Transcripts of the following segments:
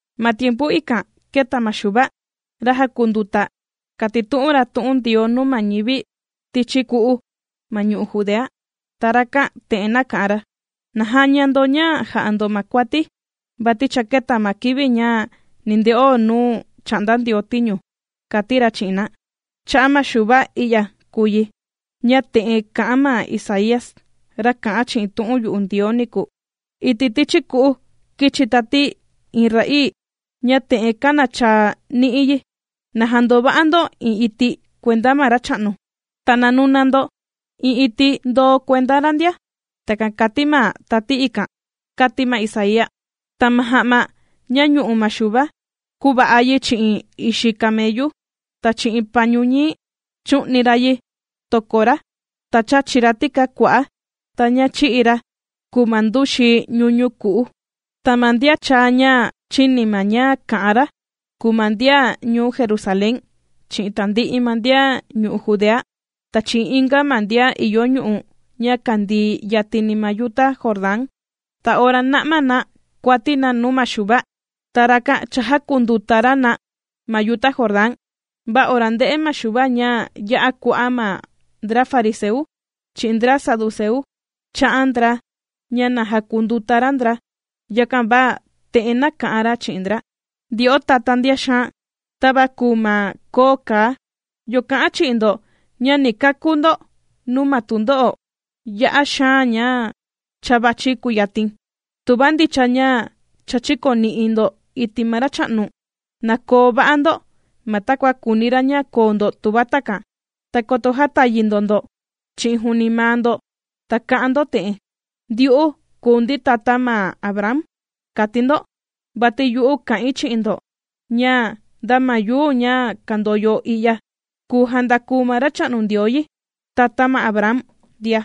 Ma tiempu ikan kēta ma Xuva, ra jàkunduta, kàtitu'un ra tu'un Ndioo nuu ma ñivi tichi ku'u ma ñu'u' Judea, ta rakan te'en nāka'an ra: ―¡Na jaña ndo ña jà'a ndo ma kuati, vati cha kēta ma kivi ña ni nde'o nuu chà'nda Ndioo tiñu! ―kàti ra chi'in na. Cha'a' ma Xuva i'ya kùu yi, ña te'en kā'an ma Isaía, ra kā'an chi'in tu'un yu'u Ndioo niku: Iti' tichi ku'u kīchi tati iin ra'ii, ña te'en kānachaa ni'i yi: “Na jandova'a ndo iin iti' kuenda ma Racha'nu, ta na nuna ndo iin iti' ndoo kuenda ra ndia.” Takan kàti ma tati ikan, kāti ma Isaía. Ta ma ja'ma ña ñu'u ma Xuva, kūva'a yi chi'in ixi kameyu, ta chi'in pañu ñii, chù'ni ra yi toko ra. Ta chàchi ra tikaa kua'á, ta ña chì'i ra, kùu ma nduxi ñuñu ku'u. Ta ma ndian chàa ña chìni ma ña kà'an ra, kùu ma ndian ñuu Jerusalén, chi'in tandi'i ma ndian ñu'u' Judea, ta chi'in inga ma ndian ìyo ñu'u' ña kandii yatini ma yuta Jordán. Ta ora nà'ma na kuati na nuu ma Xuva, ta rakan chājakunduta ra na ma yuta Jordán. Va ora ndē'e ma Xuva ña ya'a kua'a' ma ndra fariseu, chi'in ndra saduceu, kācha'an ndra, ña na jakunduta ra ndra, yakan va te'en nāka'an ra chi'in ndra: ―¡Ndyo'o tatá ndian xaan, tava kùu ma koo kaa! ¿Yo kà'an chi'in ndo ña ni kakú ndo nuu ma tundo'o ya'a xaan ña cha vàchi kuyatin? Tuva ndicha ña cha chīkoni'i ndo iti' ma Racha'nu, na koo va'a ndo ma takua kùuni ra ña koo ndo tuva takan, ta koto jätayi ndo ndo chi'in juuni maa ndo, ta ka'an ndo te'en: “Ndyu'u kùu ndi tata ma Abraham”, kati ndo. Vati yu'u kà'in chi'in ndo, ña nda ma yuu ña kàndoyo i'ya, kùu jàndaku ma Racha'nu Ndioo yi, tata ma Abraham ndia.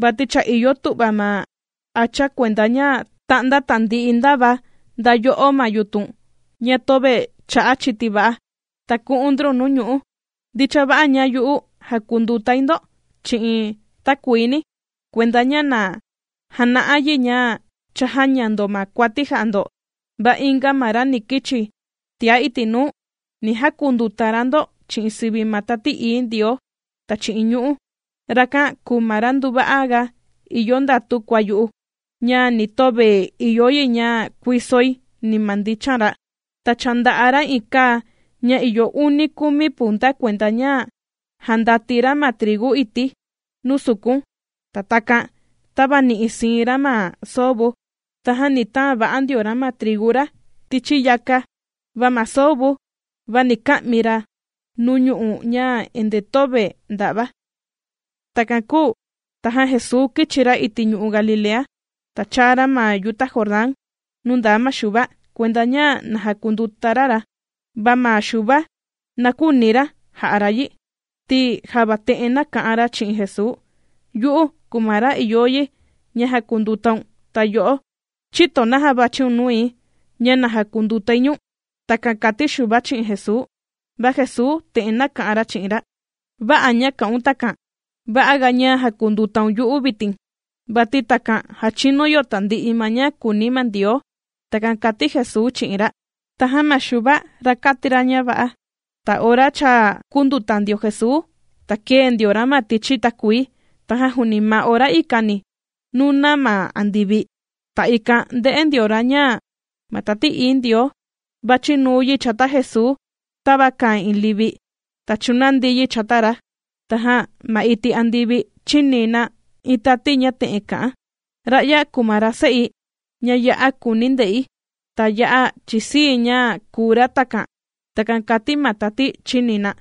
Vati cha ìyo tu'va ma hacha kuenda ña ta'nda tandi'i ndava nda yo'ó ma yutun ña töve chà'a chiti va'a, ta ku'un ndrun nuu ñu'ú. Ndicha va'a, ña yu'u jàkundutai ndo chi'in takuini, kuenda ña na jana'a yi, ña cha jāña ndo ma kuati jà'a ndo. Va inga ma ra ni kichi tia iti' nuu, ni jakunduta ra ndo chi'in sivi ma Tati Ií Ndioo, ta chi'in ñu'ú. Rakan kùu ma ra nduva'a ga ìyo ndatu kua yu'u, ña ni töve ìyo yi ña kuisoi, ni ma ndichan ra. Ta cha nda'a ra iin kaa ña ìyo uni kumi punta kuenda ña jandati ra ma trigu iti' nuu sukun, ta takan tàvani'i siin ra ma soo vu. Tajan ni taan va'a ndio ra ma trigu ra tichi yaka. Va ma soo vu, va ni ka'mi ra nuu ñu'ú ña endee töve ndà'va. Takan kūu tajan Jesuu kīchi ra iti' ñu'u' Galilea, ta chāa ra ma yuta Jordán nuu ndaa ma Xuva, kuenda ña na jakunduta ra ra. Va ma Xuva, na küuni ra ja'a ra yi, ti java te'en nāka'an ra chi'in Jesuu: ―Yu'u, kùu ma ra ìyo yi ña jakundutaun, ta yo'o, ¿chïto naja vàchiun nui, ña na jakundutai ñu̱n? ―Takan kàti Xuva chi'in Jesuu. Va Jesuu te'en nāka'an ra chi'in ra: ―Vä'a' ña kà'un takan, va'a ga ña jakundutaun yu'u vitin, vati takan jàchinu yo tandi'i ma ña kùuni ma Ndioo. ―Takan kàti Jesuu chi'in ra. Tajan ma Xuva kāti ra ña va'a. Ta ora cha kūnduta ndio Jesuu, ta kēe ndio ra ma tichi takuii, tajan juuni ma ora ikani, nūna ma andivi, ta ikan ndē'e ndio ra, ña ma Tati Ií Ndioo, vàchi nuu yi chata Jesuu tava kàa iin livi, ta chūnandi yi chata ra. Tajan ma iti' andivi chīni na iin tati ña te'en kà'an: ―Ra'ya kùu ma ra Se'i, ña ya'a kùuni̱ nde'i, ta ya'a chìsii̱ ña kùu ra takan. ―Takan kàti ma tati chīni na.